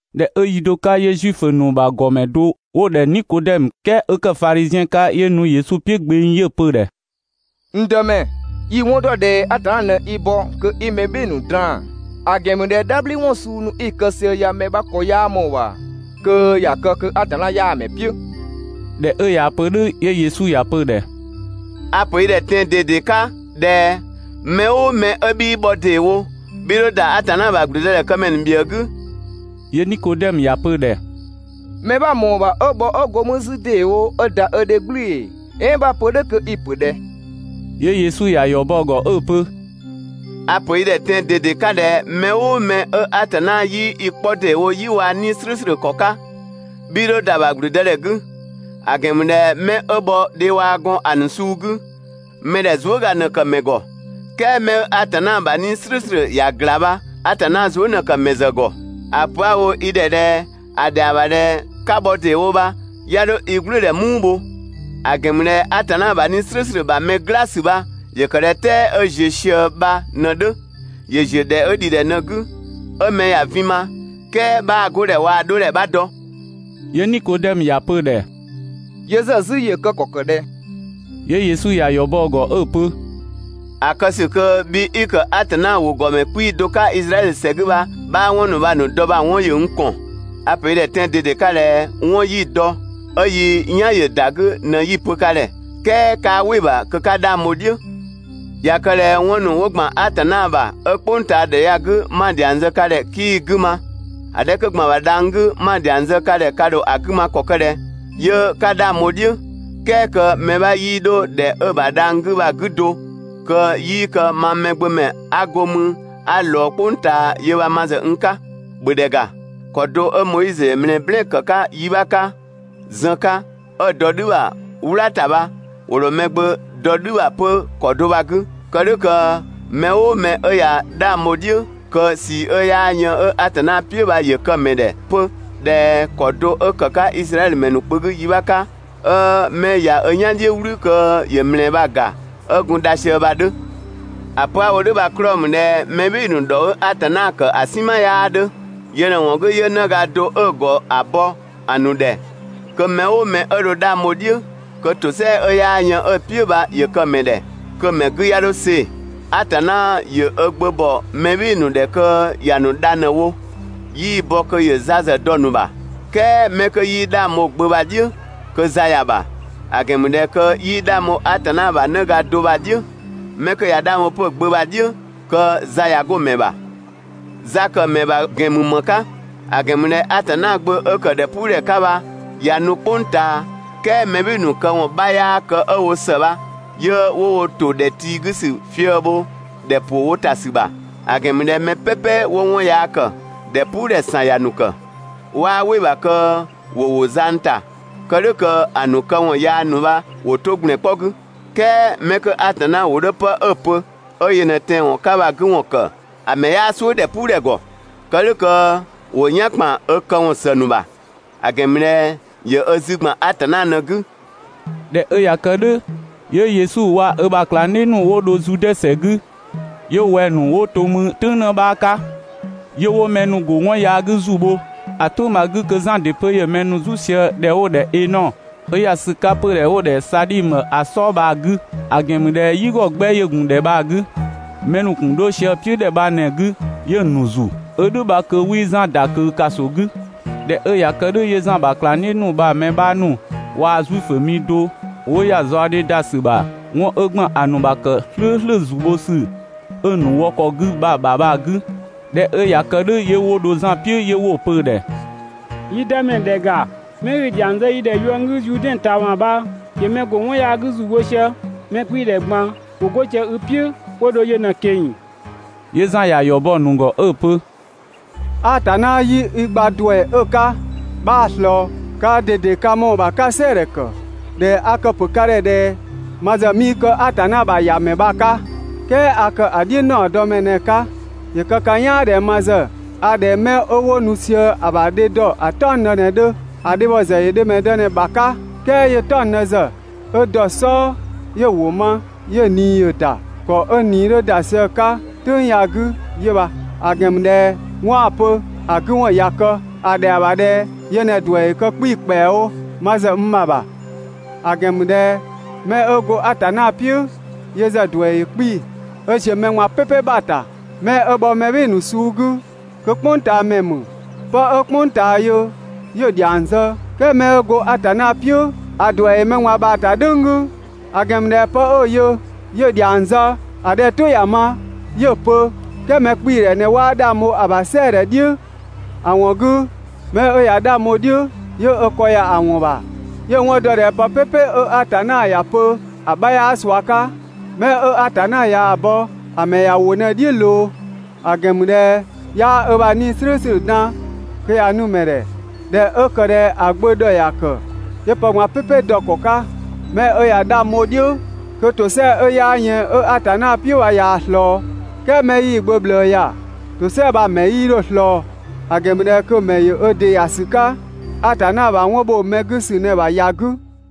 ꞊Dhɛ 'ö yi do 'ka 'yö Zuifö ‑nu ‑bha ‑gɔmɛ do 'wo‑ ‑dhɛ Nikodɛmö, "kɛɛ 'ö ‑kë Fadhiziɛn 'ka, 'yö nu Yesu "piʋ̈ gbeng, 'yö‑ pö‑ ‑dhɛ: «N Dëmɛ, yi‑ 'wɔn ‑dɔ ꞊dhɛ Atanna ꞊në i bɔ kö 'i mɛ "bhɩɩ‑ ‑nu draan‑; ‑a ‑gɛn ‑mü ꞊dhɛ "dhabhliwɔn suu ‑nu 'i‑ ‑kë sië ya mɛ 'bha ‑kɔ 'yaa ꞊mɔɔ‑ ‑bha kö ‑ya kë kö Atanna 'yaa‑ ‑mɛ "piʋ̈.» ꞊Dhɛ 'ö ꞊yaa‑ pö "dhʋ̈, 'yö Yesu ‑ya pö‑ ‑dhɛ: «A‑ ‑pö i ‑dhɛ tɛan‑ ꞊dede 'ka ꞊dhɛ: Mɛ "ʋʋ mɛ 'ö 'bhii bhɔ ‑deewo, 'bhii 'dho ‑da Atanna ‑bha ‑gblüdëdhɛkëmɛ ‑nu ‑bhiëë 'gü.» 'Yö Nikodɛmö ‑ya pö‑ ‑dhɛ: «Mɛ 'bha‑ ‑mɔɔ ‑bha 'ö bhɔ 'ö go mü 'zü ‑deewo 'ö ‑da ö dhe "gblʋ̈ʋ̈‑ ‑ee? "Ɛɛn 'bha‑ pö "dhʋ̈ kö i‑ ‑pö ꞊dhɛ?» 'Yö Yesu ‑ya ‑yɔ bɔ‑ ‑gɔ 'ö‑ pö: «A‑ ‑pö i ‑dhɛ tɛan‑ ꞊dede 'ka ꞊dhɛ mɛ "ʋʋ mɛ 'ö Atanna 'yii i 'kpɔ ‑deewo "yi waa‑ 'Nii‑ "slʋ̈ʋ̈slʋ̈ ‑kɔ 'ka, 'bhii 'dho ‑da ‑bha ‑gblüdëdhɛ 'gü. ‑A ‑gɛn ‑mü ꞊dhɛ 'mɛ 'ö bhɔ dhe waa‑ gɔn ‑a ‑nu suu 'gü, mɛ ‑dhɛ zuëga ꞊në ‑kë ‑mɛ ‑gɔ; "kɛɛ 'mɛ 'ö Atanna ‑bha 'Nii‑ "slʋ̈ʋ̈slʋ̈ ‑ya ‑gla bha, Atanna zuë" ꞊në ‑kë ‑mɛ ‑zë ‑gɔ. ‑A pö 'a‑ wo i ‑dhɛ ꞊dhɛ ‑a ‑dhɛa ‑bha ꞊dhɛ 'ka bhɔ ‑deewo bha 'ya 'dho i "gblʋ̈ʋ̈dhɛ "muu bho; ‑a ‑gɛn ‑mü ꞊dhɛ Atanna ‑bha 'Nii‑ "slʋ̈ʋ̈slʋ̈ ‑bha mɛ "gla ‑sü bha ‑yö ‑kë ꞊dhɛ "tɛɛ 'ö ‑ziö ꞊sië bha ꞊në‑ 'dhö; ‑yö ‑ziö ‑dhɛ 'ö ‑dhi ‑dhɛ ꞊në‑ 'gü, 'ö mɛ ‑ya vin ma, "kɛɛ 'bhaa‑ 'godhɛ waa‑ 'dhodhɛ 'bha dɔ. 'Yö Nikodɛmö ‑ya pö‑ ‑dhɛ: «Yö ‑zë 'zü ‑yö kë ‑kɔ ‑kë ꞊dhɛ?» 'Yö Yesu ‑ya ‑yɔ bɔ‑ ‑gɔ 'ö‑ pö: «‑A kë ‑sü kö bhi 'i ‑kë Atanna ‑wʋ ‑gɔmɛ 'kpii‑ do 'ka Izraɛdhö ‑sɛ 'gü bha 'bhaa 'wɔn ‑nu bha‑ ‑nu dɔ bha‑ 'wɔn ‑yö n ‑kɔn. A‑ ‑pö i ‑dhɛ tɛan‑ ꞊dede 'ka ꞊dhɛ 'wɔn 'yi‑ dɔ, 'ö yi "yan‑ ‑yö ‑da 'gü ꞊në 'yi‑ pö ka ‑dhɛ, "kɛɛ 'kaa "wɩ‑ ‑bha kö 'ka 'dhang bho‑ "dhiʋ̈. ꞊Ya kë ꞊dhɛ 'wɔn ‑nu 'wo ‑gban Atanna ‑bha, 'ö "kpʋngtaadhɛ ya‑ 'gü 'ma‑ ‑dhiang zë ka ‑dhɛ 'kii‑ 'gü ma, ‑a 'dhɛ 'kö ‑gban ‑bha dhang‑ 'gü 'ma‑ ‑dhiang zë ka ‑dhɛ ka ‑dho ‑a 'gü ma ‑kɔ kë ꞊dhɛ 'yö 'ka 'dhang bho‑ "dhiʋ̈, "kɛɛ kö mɛ 'bha 'yii 'dho ‑dhɛ 'ö‑ ‑bha dhang‑ 'gü bha‑ 'gü do kö 'yii kë mang Mɛgbömɛ 'a go 'mü 'a ꞊lɔɔ "kpʋng ꞊taa yö bha ma ‑zë n 'ka?» ‑Bhö ‑dhɛ ‑ga, ‑kɔ do 'ö Moizö ‑yö ‑mlɛɛ "blɛɛn‑ ‑kë 'ka yi 'bha 'ka zën 'ka 'ö‑ dɔ "dhü ‑bha "wla ‑ta bha, ‑wo ‑dho Mɛgbömɛ dɔ "dhü bha 'pö ‑kɔ do bha‑ 'gü, kë "dhʋ̈ kö mɛ "ʋʋ mɛ 'ö ꞊ya 'dhang bho‑ "dhiʋ̈, kö ꞊sii 'ö 'yaa yën 'ö Atanna "piʋ̈ bha ‑yö kë‑ ‑mɛ ‑dhɛ 'pö (꞊dhɛ ‑kɔ do 'ö ‑kë 'ka Izraɛdhö ‑mɛ ‑nu kpö 'gü yi 'bha 'ka, 'ö 'mɛ ꞊ya ö "yan "dhiʋ̈ "wlü kö ‑yö ‑mlɛɛ bha‑ ‑ga 'ö gun dha sië bha‑ 'dhö.) ‑A pö 'a‑ wo "dhʋ̈ bha‑ 'klɔɔ‑ ‑mü ꞊dhɛ mɛ "bhɩɩ‑ ‑nu ‑dhɔ 'ö Atanna ‑kë ‑a "sinma 'yaa 'dhö. Yö ꞊në‑ ‑wɔn 'gü 'yö 'në ga do 'ö‑ ‑gɔ ‑a bɔ‑ ‑nu ‑dhɛ, kö mɛ "ʋʋ mɛ 'ö dho 'dhang bho‑ "dhiʋ̈, kö ‑tosɛa 'ö 'yaa yën 'ö‑ "piʋ̈ bha ‑yö kë‑ ‑mɛ ‑dhɛ, kö‑ ‑mɛ 'gü 'ya 'dho see‑. Atanna ‑yö ö Gbö ‑bɔ mɛ "bhɩɩ‑ ‑nu ‑dhɛ kö ‑ya ‑nu dha ꞊në‑ wo, 'yii‑ bɔ kö ‑yö za ‑zë dɔ‑ ‑nu ‑bha. "Kɛɛ 'mɛ 'kö 'yii 'dhang bho‑ Gbö bha‑ "dhiʋ̈, kö za ‑ya ‑bha. ‑A ‑gɛn ‑mü ꞊dhɛ kö 'yii 'dhang bho Atanna ‑bha 'në ga do bha‑ "dhiʋ̈. 'Mɛ 'kö ꞊ya 'dhang bho 'pö‑ Gbö bha‑ "dhiʋ̈ kö za ꞊ya 'go‑ ‑mɛ ‑bha. Za kë mɛ ‑bha ‑gɛn ‑mü ‑më 'ka? ‑A ‑gɛn ‑mü ꞊dhɛ (Atanna Gbö 'ö ‑kë) ‑dhɛpuudhɛ 'ka bha ꞊ya nu "kpʋng ꞊taa, "kɛɛ mɛ "bhɩɩ‑ ‑nu këwɔn 'bha 'yaa kë 'ö‑ wo ‑së bha, 'yö 'wo wo ‑to ‑dhɛ tii 'gü ‑sü fië‑ bho ‑dhɛ ‑pʋ wo ‑ta ‑sü ‑bha. ‑A ‑gɛn ‑mü ꞊dhɛ mɛ "pɛpɛ 'wo 'wɔn yaa ‑kë, ‑dhɛpuudhɛ ‑san ‑ya ‑nu ‑kë. 'Waa "wɩ‑ ‑bha kö ‑wo ‑wo zang ‑ta, kë "dhʋ̈ kö‑ ‑nu këwɔn yaa ‑nu bha ‑wo 'to ‑gblɛn 'kpɔ 'gü. "Kɛɛ 'mɛ 'kö Atanna ‑wʋ 'dhö 'pë 'ö‑ pö, 'ö yö ꞊në tɛanwɔn 'ka bha‑ 'gü ‑wɔn ‑kë, ‑a ‑mɛ 'yaa "suʋ̈ ‑dhɛpuudhɛ ‑gɔ. Kë "dhʋ̈ kö ‑wo "yan ‑kpan ö këwɔn ‑së ‑nu ‑bha. ‑A ‑gɛn ‑mü ꞊dhɛ ‑yö ö zü ‑gban Atanna ꞊në‑ 'gü. ꞊Dhɛ 'ö ꞊ya kë "dhʋ̈, 'yö Yesu waa‑ ö ‑bha ꞊klangdhiʋ̈ ‑nu 'wo dho Zude ‑sɛ 'gü, 'yö wɛng‑ ‑nu 'wo to mü "tʋ̈ng 'në 'bha 'ka 'yö 'wo mɛ ‑nu ‑go 'wɔn yaa 'gü ‑zu bho. ‑A "tʋ̈ng bha‑ 'gü kö Zan ‑dɩ 'pö ‑yö mɛ "zu sië 'pö ‑dhɛ 'wo‑ ‑dhɛ ‑dhɛ Ɛnɔ, 'ö ‑ya ‑sü 'ka 'pödhɛ 'wo‑ ‑dhɛ Sadhimö ‑a "sɔɔ bha‑ 'gü; ‑a ‑gɛn ‑mü ꞊dhɛ "yigɔ 'gbɛ ‑yö ‑gun ‑dhɛ bha‑ 'gü. Mɛ ‑nu ‑gun 'dho sië‑ "piʋ̈ (‑dhɛ bha ꞊në‑ 'gü) 'yö‑ ‑nu ‑zu. ('Ö "dhʋ̈ bha kö 'wii Zan ‑da ꞊kö ‑kaso 'gü.) ꞊Dhɛ 'ö ꞊ya kë "dhʋ̈ 'yö Zan ‑bha ꞊klangdhiʋ̈ ‑nu bha‑ mɛ 'bha ‑nu waa‑ Zuifö mi do 'wo ‑ya zaɔdhe ‑da ‑sü ‑bha 'wɔn 'ö ‑gban ‑a ‑nu ‑bha ‑kë "slʋ̈ʋ̈slʋ̈ ‑zu bho ‑sü 'ö‑ ‑nu wɔ ‑kɔ 'gü ‑a ‑bha bha‑ 'gü. ꞊Dhɛ 'ö ꞊ya kë "dhʋ̈ 'yö 'wo dho Zan "piʋ̈ 'yö 'wo‑ pö‑ ‑dhɛ: «Yi Dëmɛ, ‑dhɛ ‑ga, 'mɛ 'i‑ ‑dhiang zë yi ‑dhɛ yuënggü Zuudɛn ꞊taama bha ‑yö mɛ ‑go 'wɔn yaa 'gü ‑zu bho sië, mɛ 'kpii‑ ‑dhɛ ꞊gban ‑wo 'go sië i "piʋ̈ 'wo dho yö ꞊në‑ ꞊keng‑. 'Yö Zan ‑ya ‑yɔ bɔ‑ ‑nu ‑gɔ 'ö‑ pö: «Atanna 'yii i gba ‑duɛ 'ö‑ 'ka 'bhaa‑ ꞊slɔɔ. Kaa ꞊dede ka ‑mɔɔ ‑bha 'ka‑ "sɛɛdhɛ ‑kë ꞊dhɛ a kë‑ ‑pö ka ‑dhɛ ꞊dhɛ ma ‑zë 'mii kë Atanna ‑bha ‑Yamɛ bha‑ 'ka, "kɛɛ a ‑kë ‑a "dhiʋ̈ ‑naɔdɔmɛ ꞊në‑ 'ka. ‑Yö kë ka "yaan ꞊dhɛ ma ‑zë a ꞊dhɛ 'mɛ 'wo nu sië‑ ‑bha dhe dɔ ‑a "taɔngdë ꞊në‑ 'dhö. ‑A dhebhɔ ‑zë ‑yö dhemɛdë ꞊në‑ ‑bha 'ka, "kɛɛ 'yö‑ "taɔngdë ‑zë 'ö dɔ‑ "sɔɔ, 'yö‑ ‑wʋ ma, 'yö‑ ꞊nii ‑yö ‑da. ‑Kɔ 'ö n ꞊nii 'dhö ‑da sië‑ 'ka ("tʋ̈ng ya‑ 'gü) 'yö bha; ‑a ‑gɛn ‑mü ꞊dhɛ 'wɔn 'a‑ pö ‑a 'gü ‑wɔn ꞊ya kë. ‑A ‑dhɛa ‑bha ꞊dhɛ yö ꞊në‑ ‑duɛ ‑yö kë 'kpii‑ ‑kpɛawo ma ‑zë n ‑bha ‑bha, ‑a ‑gɛn ‑mü ꞊dhɛ 'mɛ 'ö go Atanna "piʋ̈ yö ‑zë ‑duɛ ‑yö 'kpii‑ 'ö ‑ziö mɛ ꞊gban "pɛpɛ ‑bha ‑ta. Mɛ 'ö bhɔ mɛ "bhɩɩ‑ ‑nu suu 'gü kö "kpʋngtaamɛ ‑mü. Pë 'ö "kpʋng ꞊taa yö 'yö‑ ‑dhiang zë, "kɛɛ 'mɛ 'ö go Atanna "piʋ̈ ‑a ‑duɛ ‑yö mɛ ꞊gban ‑bha ‑ta "dhʋ̈ng 'gü; ‑a ‑gɛn ‑mü ꞊dhɛ 'pë 'ö‑ yö, 'yö‑ ‑dhiang zë, ‑a 'dhɛ 'ö‑ "tʋ ‑ya ma, 'yö‑ pö, "kɛɛ mɛkpiidhɛ ꞊në 'waa 'dhang bho‑ ‑bha "sɛɛdhɛ "dhiʋ̈. ‑A ‑wɔn 'gü, 'mɛ 'ö ꞊ya 'dhang bho‑ "dhiʋ̈, 'yö ö ‑kɔ ‑ya ‑wɔn ‑bha, 'yö‑ 'wɔn dɔ ꞊dhɛ pë "pɛpɛ 'ö Atanna ‑ya pö ‑a 'bha 'yaa ꞊sua 'ka. 'Mɛ 'ö Atanna ꞊yaa‑ bɔ, ‑a ‑mɛ ‑ya ‑wʋ ꞊në‑ "dhiʋ̈ ꞊loo, ‑a ‑gɛn ‑mü ꞊dhɛ 'yaa ö bha 'Nii‑ "slʋ̈ʋ̈slʋ̈ dan kö ‑ya nu‑ ‑mɛ ‑dhɛ. ꞊Dhɛ 'ö ‑kë ꞊dhɛ ‑a Gbö ‑dhɔ ‑ya ‑kë, 'yö pë ꞊gban "pɛpɛ dɔ‑ ‑kɔ 'ka. 'Mɛ 'ö ꞊ya 'dhang bho‑ "dhiʋ̈, kö ‑tosɛa 'ö 'yaa yën 'ö Atanna "piʋ̈ bha ꞊yaa‑ ꞊slɔɔ, "kɛɛ 'mɛ 'yii‑ Gbö ꞊bhlëë ‑ya, ‑tosɛa bha‑ ‑mɛ 'yii 'dho‑ ꞊slɔɔ; ‑a ‑gɛn ‑mü ꞊dhɛ kö ‑yö ö ‑dɩ ‑ya ‑sü 'ka Atanna ‑bha 'wɔn ‑bho mɛ 'gü ‑sü ꞊në‑ ‑bha ‑ya 'gü.